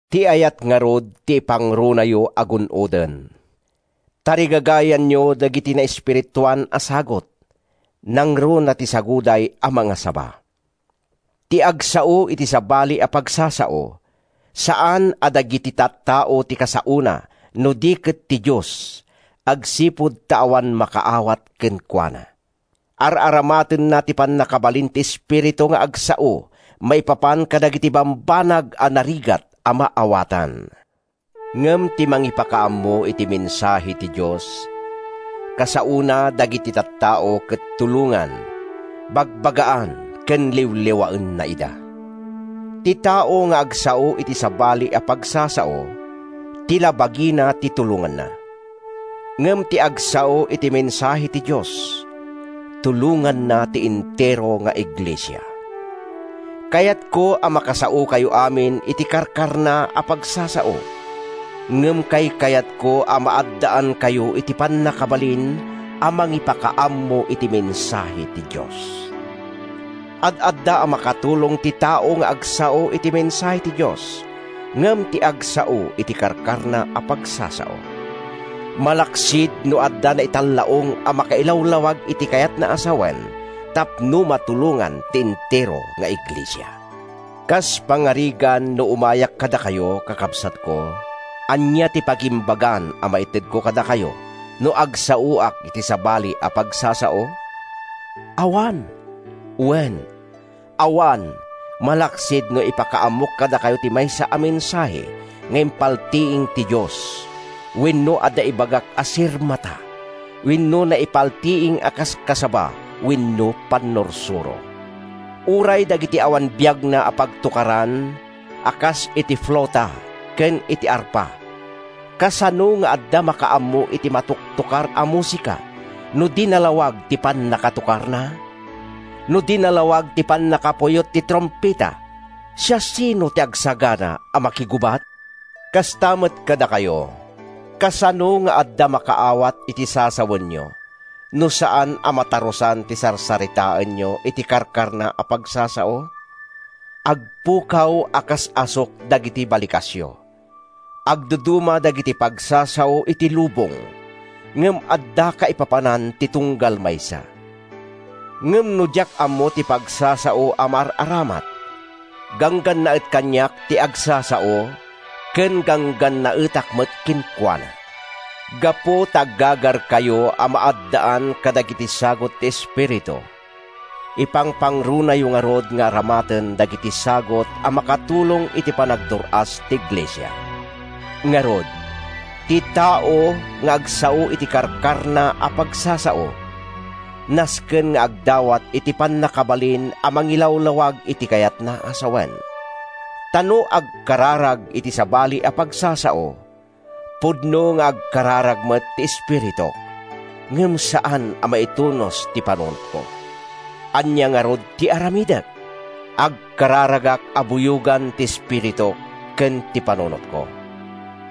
Ti ayat ngarud ti ipangrunayo a gun-oden. Tarigagayanyo dagiti naespirituan a sagut, nangruna ti saguday a mangasaba. Ti agsao iti sabali a pagsasao, saan a dagiti tattao ti kasaona no di ket ti Dios agsipud ta awan makaawat kenkuana. Ar-aramatenna ti pannakabalin ti Espiritu nga agsao maipapan kadagiti bambanag a narigat a maawatan. Ngem ti mangipakaammo iti mensahe ti Dios, kasaona dagiti tattao ket tulongan, bagbagaan ken liwliwaenna ida. Ti tao nga agsao iti sabali a pagsasao, ti la bagina ti tulonganna. Ngem ti agsao iti mensahe ti Dios, tulonganna ti entero nga iglesia. Kayatko a makasaokayo amin iti karkarna a pagsasao, ngem kaykayatko a maaddaankayo iti pannakabalin a mangipakaammo iti mensahe ti Dios. Ad-adda a makatulong ti tao nga agsao iti mensahe ti Dios ngem ti agsao iti karkarna a pagsasao—malaksid no adda naitallaong a makailawlawag iti kayatna a sawen tapno matulongan ti entero nga iglesia. Kas pangarigan no umayak kadakayo, kakabsatko, ania ti pagimbagan a maitedko kadakayo no agsaoak iti sabali a pagsasao? Awan! Wen, awan, malaksid no ipakaammok kadakayo ti maysa a mensahe nga impaltiing ti Dios wenno adda ibagak a sirmata wenno naipaltiing a kaskasaba wenno pannursuro. Uray dagiti awan biagna a pagtokaran, a kas iti fluta ken iti arpa, kasano nga adda makaammo iti matoktokar a musika no di nalawag ti pannakatokarna? No di nalawag ti pannakapuyot ti trumpeta, siasino ti agsagana a makigubat? Kasta met kadakayo, kasano nga adda makaawat iti sasawenyo no saan a matarusan ti sarsaritaenyo iti karkarna a pagsasao? Agpukaw a kas asuk dagiti balikasyo. Agduduma dagiti pagsasao iti lubong, ngem adda kaipapanan ti tunggal maysa. Ngem no diak ammo ti pagsasao a maar-aramat, ganggannaet kaniak ti agsasao ken ganggannaetak met kenkuana. Gapu ta aggagarkayo a maaddaan kadagiti sagut ti Espiritu, ipangpangrunayo ngarud nga aramaten dagiti sagut a makatulong iti panagdur-as ti iglesia. Ngarud, ti tao nga agsao iti karkarna a pagsasao, nasken nga agdawat iti pannakabalin a mangilawlawag iti kayatna a sawen. Ta no agkararagak iti sabali a pagsasao, pudno nga agkararag met ti espirituk, ngem saan a maitunos ti panunotko. Ania ngarud ti aramidek? Agkararagak a buyogan ti espirituk ken ti panunotko.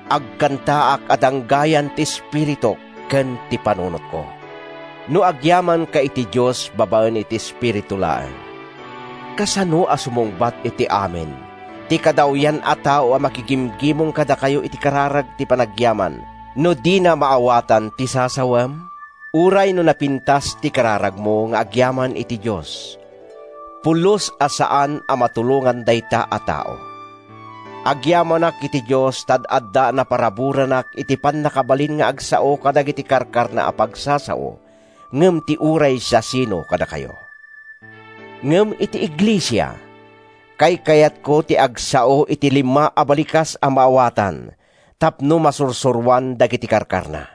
Agkantaak a danggayan ti espirituk ken ti panunotko. No agyamanka iti Dios babaen iti espiritu laeng, kasano a sumungbat iti “Amen” ti kadawyan a tao a makigimgimong kadakayo iti kararag ti panagyaman no dina maawatan ti sasawem? Uray no napintas ti kararagmo nga agyaman iti Dios, pulos a saan a matulongan dayta a tao. Agyamanak iti Dios ta ad-adda a naparaburanak iti pannakabalin nga agsao kadagiti karkarna a pagsasao ngem ti uray siasino kadakayo. Ngem iti iglesia, kaykayatko ti agsao iti lima a balikas a maawatan tapno masursuroan dagiti karkarna,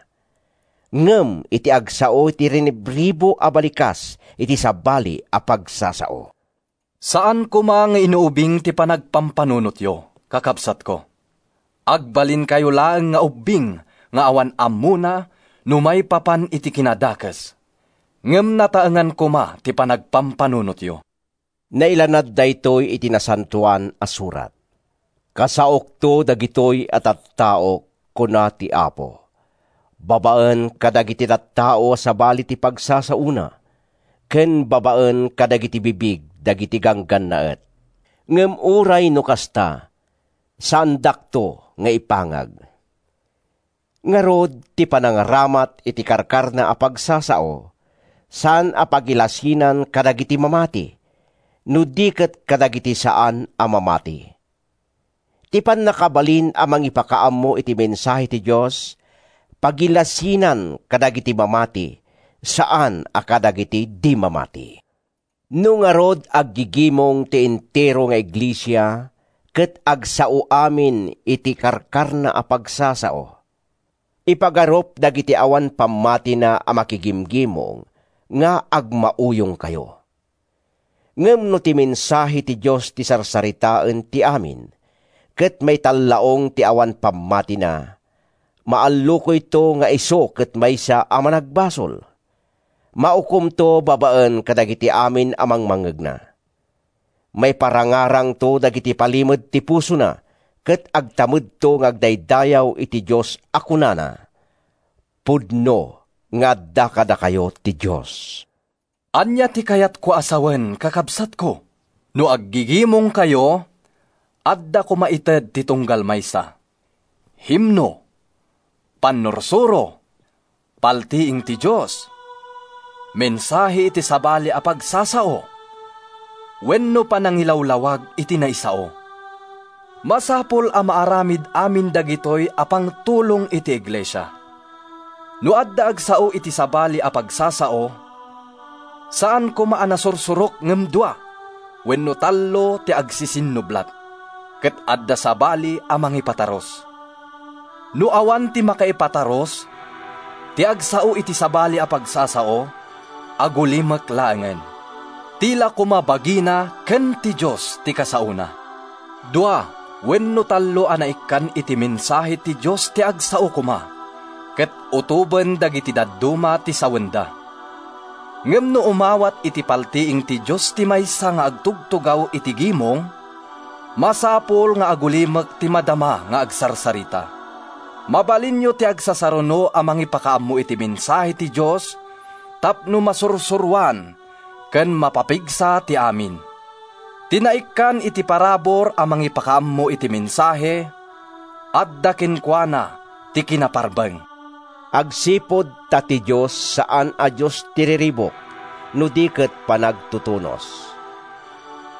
ngem iti agsao iti rinibribu a balikas iti sabali a pagsasao. Saan koma nga inuubing ti panagpampanunotyo, kakabsatko. Agbalinkayo laeng nga ubbing nga awan ammona no maipapan iti kinadakes, ngem nataengan koma ti panagpampanunotyo. Nailanad daytoy iti Nasantoan a Surat: “Kasaokto dagitoy a tattaok, kuna ti Apo, babaen kadagiti tattao a sabali ti pagsasaona, Ken babaen kadagiti bibig dagiti ganggannaet. Ngem uray no kasta, saandakto nga ipangag.” Ngarud, ti panagaramat iti karkarna a pagsasao, saan a pagilasinan kadagiti mamati, no di ket kadagiti saan a mamati. Ti pannakabalin a mangipakaammo iti mensahe ti Dios, pagilasinan kadagiti mamati, saan a kadagiti di mamati. No ngarud aggigimong ti entero nga iglesia ket agsao amin iti karkarna a pagsasao, ipagarup dagiti awan pammatina a makigimong nga agmauyongkayo. Ngem no ti mensahe ti Dios ti sarsaritaen ti amin, ket maitallaong ti awan pammatina, maallukoyto nga isu ket maysa a managbasol. Maukomto babaen kadagiti amin a mangngegna. Maiparangarangto dagiti palimed ti pusona ket agtamedto nga agdaydayaw iti Dios a kunana, “Pudno nga adda kadakayo ti Dios!” Ania ti kayatko a sawen, kakabsatko? No aggigimongkayo, adda koma ited ti tunggal maysa: himno, pannursuro, paltiing ti Dios, mensahe iti sabali a pagsasao wenno panangilawlawag iti naisao. Masapul a maaramid amin dagitoy a pangtulong iti iglesia. No adda agsao iti sabali a pagsasao, saan koma a nasursurok ngem dua wenno tallo ti agsisinnublat, ket adda sabali a mangipatarus. No awan ti makaipatarus, ti agsao iti sabali a pagsasao, agulimek laengen. Ti la koma bagina ken ti Dios ti kasaona. Dua wenno tallo a naikkan iti mensahe ti Dios ti agsao koma, ket utoben dagiti dadduma ti sawenda. Ngem no umawat iti paltiing ti Dios ti maysa nga agtugtugaw iti gimong, masapul nga agulimek ti madama nga agsarsarita. Mabalinyo ti agsasaruno a mangipakaammo iti mensahe ti Dios tapno masursuroan ken mapapigsa ti amin. Ti naikkan iti parabur a mangipakaammo iti mensahe adda kenkuana ti kinaparbeng, agsipud ta ti Dios saan a Dios ti riribuk no di ket panagtutunos.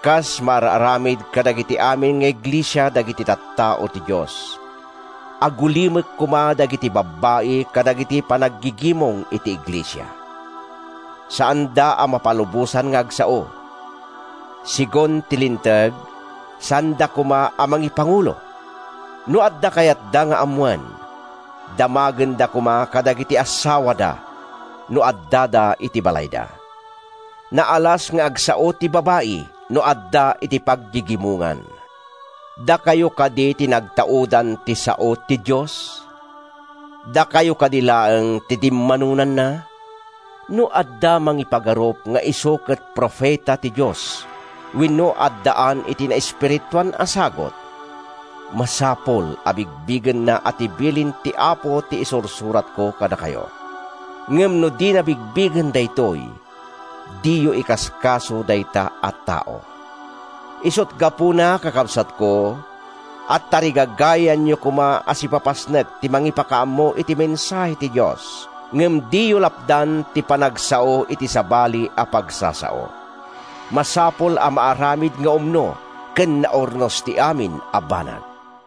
Kas maar-aramid kadagiti amin nga iglesia dagiti tattao ti Dios, agulimek koma dagiti babbai kadagiti panaggigimong iti iglesia. Saanda a mapalubosan nga agsao. Segun ti Linteg, saanda koma a mangipangulo. No adda kayatda nga ammoen, damagenda koma kadagiti assawada no addada iti balayda. Naalas nga agsao ti babai no adda iti paggigimongan. Dakayo kadi ti nagtaudan ti sao ti Dios? Dakayo kadi laeng ti dimmanonanna? No adda mangipagarup nga isu ket profeta ti Dios wenno addaan iti naespirituan a sagut, masapul a bigbigenna a ti bilin ti Apo ti isursuratko kadakayo. Ngem no dina bigbigen daytoy, diyo ikaskaso dayta a tao. Isut’ gapuna, kakabsatko, a tarigagayanyo koma a sipapasnek ti mangipakaammo iti mensahe ti Dios, ngem diyo lapdan ti panagsao iti sabali a pagsasao. Masapul a maaramid nga umno ken naurnos ti amin a banag.